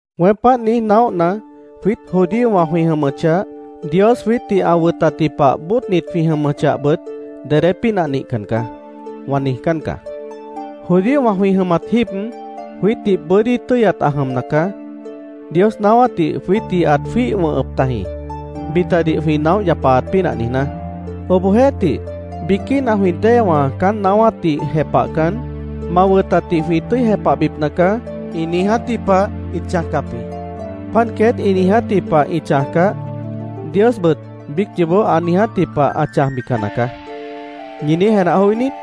Weém páant niíj naóhna, “Jwiít judíowã jwĩ jʉmʉchah, Dios jwiítdih ã wʉtatji pah bóodnit jwĩ jʉmʉchahbʉt, dedé pínah nihcan caá”, wã niijcán caá. Judíowã jwĩ jʉmat jíib, jwiítdih bʉ́dí tʉ́yat ã jʉmna caá. Dios naáwátdih jwiítdih ãt jwíih wʉ̃hʉp tajĩ, bitadih jwĩ naóh yapaat pínah niijná. Obohjeéhtih, biquína jwĩ déewã caán naáwátdih jepahcan, “Ma wʉtatdih jwĩ tʉ́i jepahbipna caá”, ĩ niijátji pah ĩt chãjcap jĩ. “Páant queét ĩ niijátji pah ĩ chãjcah, Diosbʉt biíc yoobó ã niijátji pah ã chãjbican nacaá”, ¿ñi niíj jenah joí niít?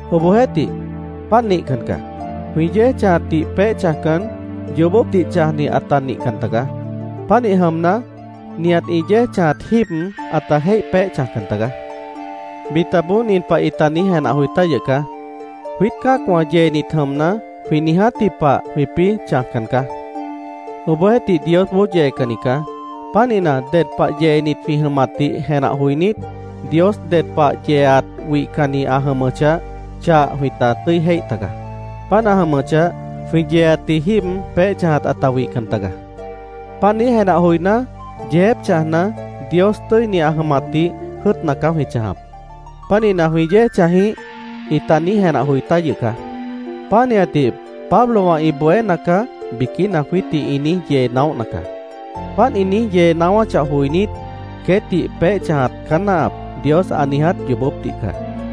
Obohjeéhtih, páant nihcan caá. Jwĩ yéej chãjatdih peéh chãjcan, yoobópdih chãjni ãta nihcan tagaá. Pánih jʉmna, nihat ĩ yéej chãjat jíib ãta jéih peéh chãjcan tagaá. Bitaboó nin pah ĩta niíj jenah joi tá yʉh caá: “Jwiít cã́acwã yeenit jʉmna, jwĩ niijátji pah jwĩpĩ́ chãjcan caá. Obohjeéhtih, Diosboó yeecanni caá. Pánihna, ded pah yeenit jwĩ jʉmatdih jenah joinít, Dios ded pah yeeat wihcanni ã jʉmʉchah, chah jwĩta tʉ́i jéih taga. Páant ã jʉmʉchah, jwĩ yeeatji jíib peéh chãjat ãta wihcan taga. Páant niíj jenah joiná, “Yeejép chãjna, Dios tʉ́ini ã jʉmatdih jʉ́ʉtna caá jwĩ chãjap. Pánihna, ¿jwĩ yéej chãj jĩíh?” ĩta niíj jenah joi tá yʉh caá. “Pánihatdih Pablowã ĩ bohéna caá”, biquína jwiítdih ĩ niíj yee naóhna caá. Páant ĩ niíj yee naáwáchah joinít, “queétdih peéh chãjat caá náahap”, Dios ã niiját yoobópdih caá.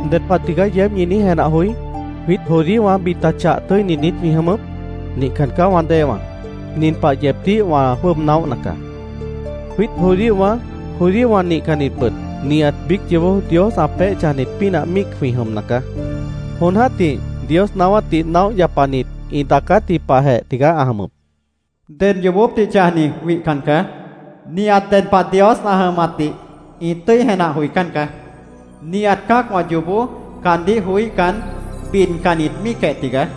¿Ded pah tigaá yeéb ñi niíj jenah joí? ¿Jwiít judíowã bita chah tʉ́init niít jwĩ jʉmʉp? Nihcan caá, wã déewã. Nin pah yeebdíh wã jwʉ́ʉb naóhna caá: Jwiít judíowã, judíowã nihcannitbʉt nihat biíc yoobó Dios ã peéh chãjnit pínah míic jwĩ jʉmna caá. Jon jã́tih Dios naáwátdih naóh yapanit ĩ daacátji pahjeh tigaá ã jʉmʉp: “Ded yoobópdih chãjni wihcan caá. Nihat ded pah Dios ã jʉmatdih ĩ tʉ́i jenah joicán caá. Nihat cã́acwã yoobó caandíh joííhcan, bidcannit míicjeh tigaá.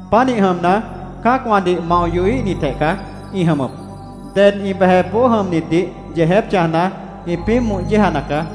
Pánihnit jʉmna, cã́acwãdih mao yohíhnitjeh caá ĩ jʉmʉp. Ded ĩ bejepboó jʉmnitdih yeejép chãjna, ĩpĩ́ moh yéejana caá.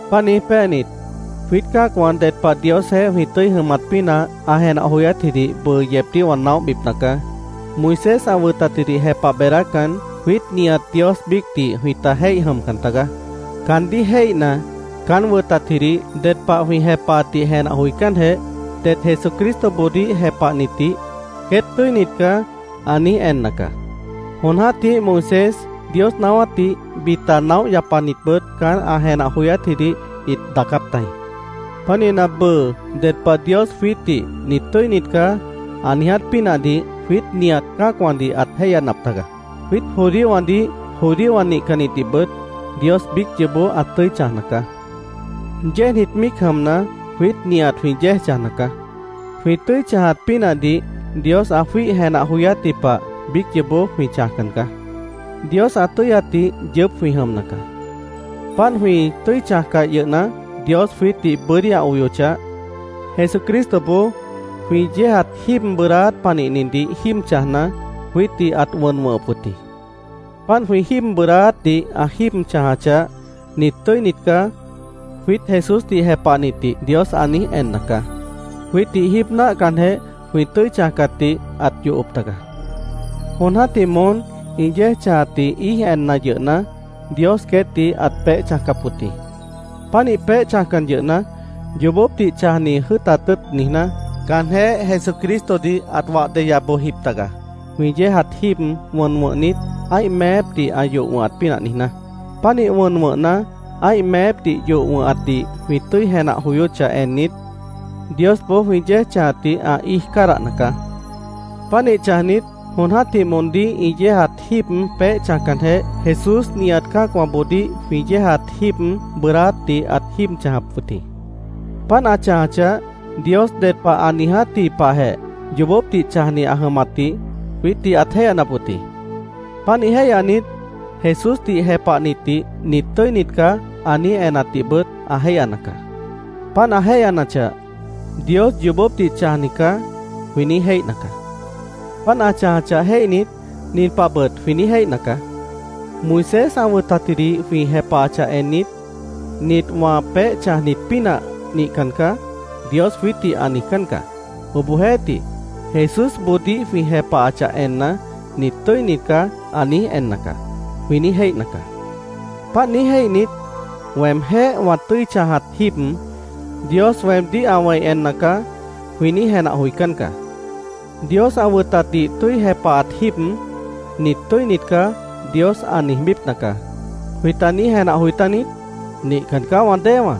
Páant niíj péanit, jwiít cã́acwã ded pah Diosjeéh jwĩ tʉ́i jʉmat pínah ã jenah joyátjidih bʉʉ yeebdíh wã naóhbipna caá. Moisés ã wʉtatjidih jepah beedácan, jwiít nihat Dios biícdih jwĩta jéih jʉmcan tagaá. Caandíh jéihna, caán wʉtatjidih ded pah jwĩ jepahatdih jenah joicánjeh, det Jesucristoboodíh jepahnitdih, “Queét tʉ́init caá”, ã niíj enna caá. Jon jã́tih Moisés, Dios naáwátdih bita naóh yapanitbʉt caán ã jenah joyátjidih ĩt daacáp tajĩ. Pánihna, bʉʉ ded pah Dios jwiítdih “Nit tʉ́init caá”, ã niiját pínahdih jwiít nihat cã́acwãdih ãt jéihyanap taga. Jwiít judíowãdih, judíowã nihcannitdihbʉt Dios biíc yoobó ã tʉ́i chãjna caá. Yéejnit míic jʉmna, jwiít nihat jwĩ yéej chãjna caá. Jwĩ tʉ́i chãjat pínahdih Dios ã jwíih jenah joyátji pah biíc yoobó jwĩ chãjcan caá. Dios ã tʉ́yatdih yʉʉ́p jwĩ jʉmna caá. Páant jwĩ tʉ́i chãjcah yʉhna, Dios jwiítdih bʉ́dí ã oyochah, Jesucristoboó jwĩ yéejat jíib bʉʉdáát panihnidih jíib chãjna, jwiítdih ãt wʉn wʉ̃hʉp wʉt jĩ. Páant jwĩ jíib bʉʉdáátdih ã jíib chãjachah, “Nit tʉ́init caá”, jwiít Jesúsdih jepahnitdih Dios ã niíj enna caá. Jwiítdih jíib náahcanjeh, jwĩ tʉ́i chãjcatdih ãt yohop taga. Jon jã́tih moón ĩ yéej chãjatdih íij enna yʉhna, Dios queétdih ãt peéh chãjcap wʉt jĩ. Pánih peéh chãjcan yʉhna, yoobópdih chãjni jʉ́ʉtat tʉ́ʉt niijná, caanjéh Jesucristodih ãt wah deya bojjip taga, jwĩ yéejat jíib wʉn wʉ̃hnit, ã́ih meépdih ã yoh wʉ̃hat pínah niijná. Pánih wʉn wʉ̃hna, ã́ih meépdih yoh wʉ̃hatdih jwĩ tʉ́i jenah joyóchah ennit, Diosboó jwĩ yéej chãjatdih ã íij cádahna caá. Pánih chãjnit, jon jã́tih moondíh ĩ yéejat jíib peéh chãjcanjeh, Jesús nihat cã́acwãboodíh jwĩ yéejat jíib bʉʉdáátdih ãt jíib chãjap wʉt jĩ. Páant ã chãjachah, Dios ded pah ã niijátji pahjeh yoobópdih chãjni ã jʉmatdih jwiítdih ãt jéihyanap wʉt jĩ. Pánih jéihyanit, Jesúsdih jepahnitdih “Nit tʉ́init caá”, ã niíj enatdihbʉt ã jéihyana caá. Páant ã jéihyanachah, “Dios yoobópdih chãjni caá”, jwĩ niíj jéihna caá. Páant ã chãjachah jéihnit, nin pahbʉt jwĩ niíj jéihna caá: “Moisés ã wʉtatjidih jwĩ jepahachah ennit, ‘Nit wã peéh chãjnit pínah nihcan caá’, Dios jwiítdih ã niijcán caá. Obohjeéhtih, Jesúsboodíh jwĩ jepahachah enna, ‘Nit tʉ́init caá’, ã niíj enna caá”, jwĩ niíj jéihna caá. Páant niíj jéihnit, “Weemjéh wã tʉ́i chãjat jíib Dios weemdíh ã wẽi enna caá”, jwĩ niíj jenah joicán caá. “Dios ã wʉtatdih tʉ́i jepahat jíib, ‘Nit tʉ́init caá’, Dios ã niijbípna caá”, ¿jwĩta niíj jenah joi tániít? ¡Nihcan caá, wã déewã!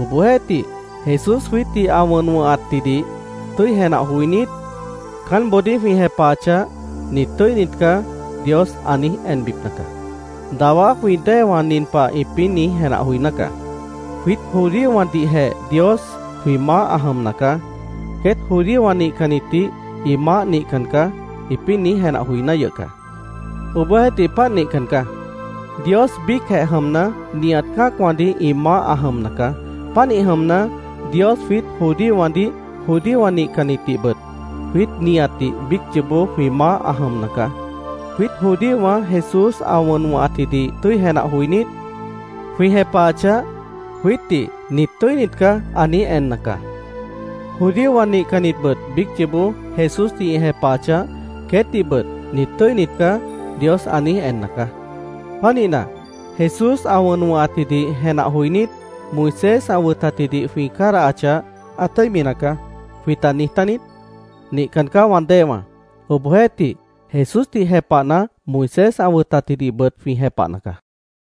Obohjeéhtih, Jesús jwiítdih ã wʉn wʉ̃hatjidih tʉ́i jenah joinít, caánboodíh jwĩ jepahachah, “Nit tʉ́init caá”, Dios ã niíj enbipna caá. Dawá jwĩ déewã nin pah ĩpĩ́ niíj jenah joiná caá: “Jwiít judíowãdihjeh Dios jwĩ maáh ã jʉmna caá. Queét judíowã nihcannitdih ĩ maáh nihcan caá”, ĩpĩ́ niíj jenah joiná yʉh caá. Obohjeéhtih, páant nihcan caá. Dios biícjeh jʉmna, nihat cã́acwãdih ĩ maáh ã jʉmna caá. Pánih jʉmna, Dios jwiít judíowãdih, judíowã nihcannitdihbʉt jwiít nihatdih biíc yoobó jwĩ maáh ã jʉmna caá. Jwiít judíowã Jesús ã wʉn wʉ̃hatjidih tʉ́i jenah joinít, jwĩ jepahachah, jwiítdih “Nit tʉ́init caá”, ã niíj enna caá. Judíowã nihcannitbʉt biíc yoobó Jesúsdih ĩ jepahachah, queétdihbʉt “Nit tʉ́init caá”, Dios ã niíj enna caá. Pánihna, Jesús ã wʉn wʉ̃hatjidih jenah joinít, ¿“Moisés ã wʉtatjidih jwĩ cádahachah, ã tʉ́imi nacaá”, jwĩta niij tániít? ¡Nihcan caá, wã déewã! Obohjeéhtih, Jesúsdih jepahna, Moisés ã wʉtatjidihbʉt jwĩ jepahna caá.